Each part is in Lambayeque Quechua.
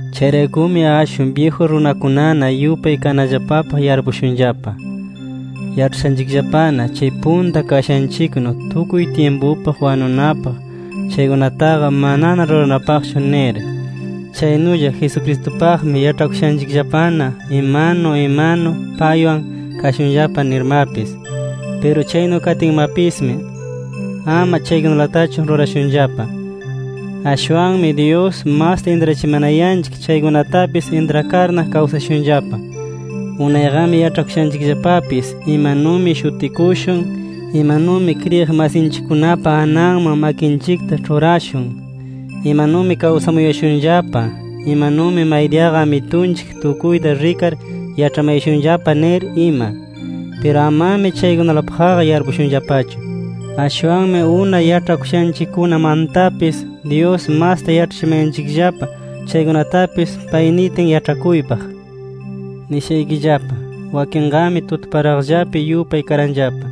Chayraykumi ashwan byiju runakunana yupay kanallapapaq yarpushunllapa. Yaĉhashanchikllapana chay punta kashanchiknu tukuy tyimpupaq wanunapaq chaykunataqa manana ruranapaqchu nir. Chaynulla Jesucristupaqmi yaĉhakushanchikllapana imanu imanu paywan kashunllapa nirmapis. Piru chaynu katinmapismi, ama chaykunalatachu rurashunllapa. Ashwanmi Dyus masta intrachimanayanchik chaykunatapis, intrakarna kawsashunllapa. Unayqami yaĉhakushanchikllapapis imanumi shutikushun, imanumi kriyiq masinchikkunapa ananman makinchikta ĉhurashun, imanumi kawsamuyashunllapa, imanumi maydiyaqa Amitunchik tukuyta rikar yaĉhamayashunllapa nir ima. Piru amami chaykunalapaqqa yarpushunllapachu. Ashwanmi unay yaĉhakushanchikkunamantapis, Dyus masta yaĉhachimayanchikllapa chaykunatapis pay nitin yaĉhakuypaq. Nishaykillapa: Wakinqami tutaparaqllapi yupay karanllapa.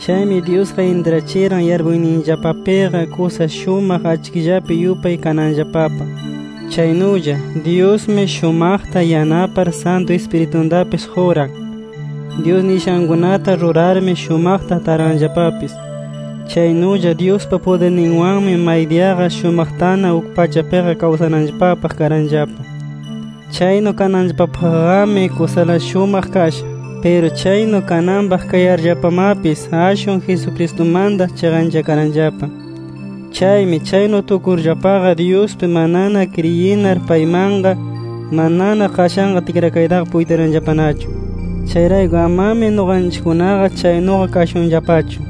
Chaymi Dyusqa intrachiran yarpuyninllapapiqa kusa shumaq achkillapi yupay kananllapapaq. Chaynulla Dyusmi shumaqta yanapar Santu Ispirituntapis quran. Dyus nishankunata rurarmi, shumaqta taranllapapis. Chaynulla Dyuspa pudirninwanmi, maydiyaqa shumaqtana uk pachapiqa kawsananllapapaq karanllapa. Chaynu kananllapapaqqami kusala shumaq kasha. Piru chaynu kananpaq kayarllapamapis, ashwan Jesucristumanta chiqanchakaranllapa. Chaymi chaynu tukurllapaqa, Dyuspi manana kriyinar, paymanqa manana qashan tikrakaytaqa puytiranllapanachu. Chayrayku, amami nuqanchikkunaqa chaynuqa kashunllapachu.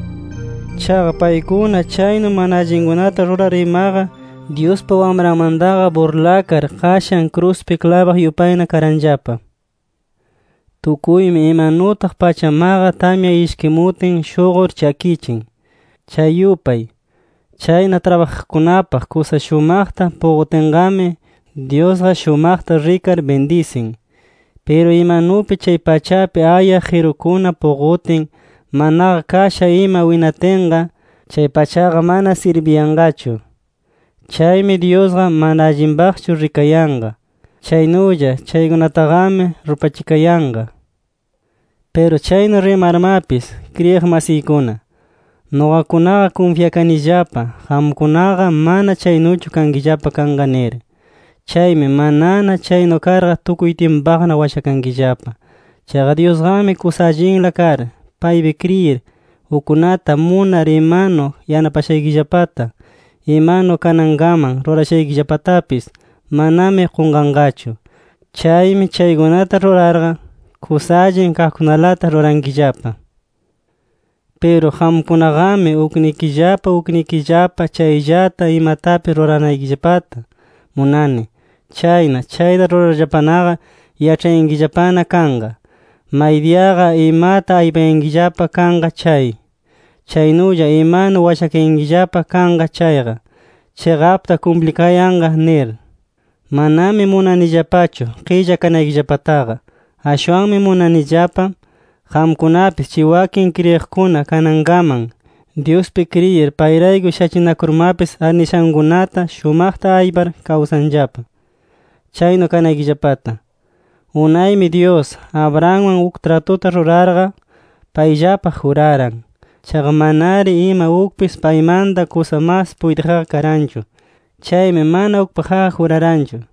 Chaqa paykuna chaynu mana allinkunata rurar imaqa, Dyuspa Wamranmantaqa burlakar qashan kruspi klabaq yupayna karanllapa. Tukuymi imanutaq pachamaqa, tamya ishkimutin shuqur chakichin, chay yupay. Chayna trabajaqkunapaq kusa shumaqta puqutinqami, Dyusqa shumaqta rikar bindisin. Piru imanupi chay pachapi ayaq qirukuna puqutin, manaqa kasha ima winatinqa, chay pachaqa mana sirbiyanqachu. Chaymi Dyusqa mana allinpaqchu rikayanqa. Chaynulla chaykunataqami rupachikayanqa. Piru chaynu rimarmapis kriyiq masiykuna, nuqakunaqa kunfyakanillapa qamkunaqa mana chaynuchu kankillapa kanqa nir. Chaymi manana chaynu karqa, tukuy tyimpupaqna washakankillapa. Chaqa Dyusqami kusa allinla kar, paypi kriyir ukkunata munar imanu yanapashaykillapata, imanu kanankaman rurayashaykillapatapis, manami qunqanqachu. Chaymi chaykunata rurarqa, kusa allin kaqkunalata rurankillapa. Piru qamkunaqami uknikillapa uknikillapa chayllata imatapis ruranaykillapata munani. Chayna chayta rurarllapanaqa yaĉhayankillapana kanqa, maydiyaqa imata aypayankillapa kanqa chay, chaynulla imanu washakayankillapa kanqa chayqa, chiqapta kumplikayanqa nir. Manami munanillapachu qilla kanaykillapataqa. Ashwanmi munanillapa, qamkunapis chay wakin kriyiqkuna kanankaman Dyuspi kriyir, payrayku shachinakurmapis arnishankunata shumaqta aypar kawsanllapa, chaynu kanaykillapata. Unaymi Dyus, Abrahamwan uk tratuta rurarqa, payllapaq juraran. Chaqa manari ima ukpis paymanta kusa mas puytiqqa karanchu. Chaymi mana ukpaqqa juraranchu.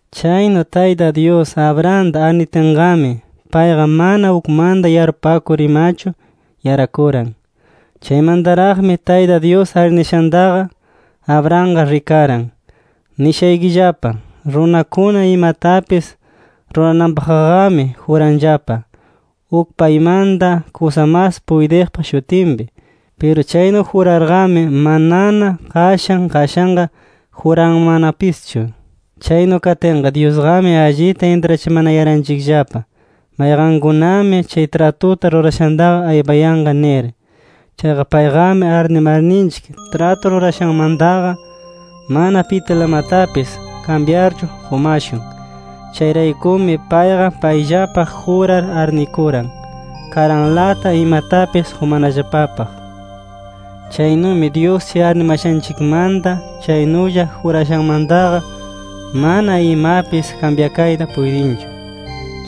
Chaynu Tayta Dyus, Abrahamta arnitinqami, payqa mana ukmanta yarpupakur imachu yarakuran. Chaymantaraqmi Tayta Dyus arnishantaqa, Abrahamqa rikaran. Nishaykillapa: Runakuna imatapis rurananpaqqami juranllapa uk paymanta kusa mas puytiqpa shutinpi. Piru chaynu jurarqami, manana qashan qashanqa juranmannapischu. Chaynu katinqa, Dyusqami allita intrachimanayaranchikllapa, mayqankunami chay tratuta rurashantaqa aypayanqa nir. Chaqa payqami arnimarninchik tratu rurashanmantaqa, mana pitilamatapis kambyarchu qumashun. Chayraykumi payqa payllapaq jurar arnikuran, karanlata imatapis qumanallapapaq. Chaynumi Dyus chay arnimashanchikmanta, chaynulla jurashanmantaqa, mana imapis kambyakayta puytinchu.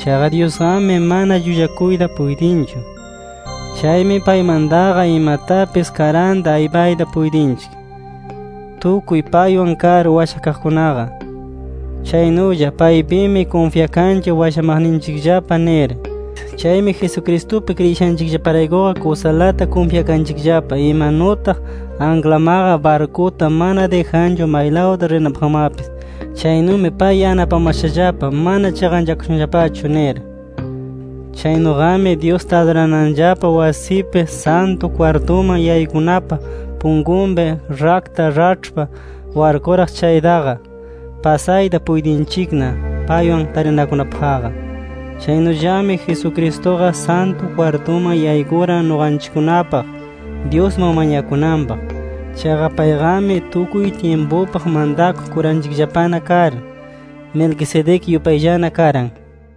Chaqa Dyusqami mana llullakuyta puytinchu. Chaymi paymantaqa imatapis karanta aypayta puytinchik, tukuy paywan kar washakaqkunaqa. Chaynulla paypimi kunfyakanchik washamaqninchikllapa nir. Chaymi Jesucristupi kriyishanchikllaparaykuqa kusalata kunfyakanchikllapa imanutaq anklamaqa barkuta mana dijanchu maylawta rinanpaqmapis chaynumi pay yanapamashallapa mana chiqanchakashunllapachu nir. Chaynuqami Dyusta adurananllapa wasipi, Santu kwartuman yaykunapa punkunpi rakta raĉhpa warkuraq chaytaqa, pasayta puytinchikna paywan tarinakunapaqqa. Chaynullami Jesucristuqa Santu kwartuman yaykuran nuqanchikkunapaq Dyusman mañakunanpaq. Chaqa payqami tukuy tyimpupaq mantakuq kuranchikllapana kar, Melquisedec yupayllana karan.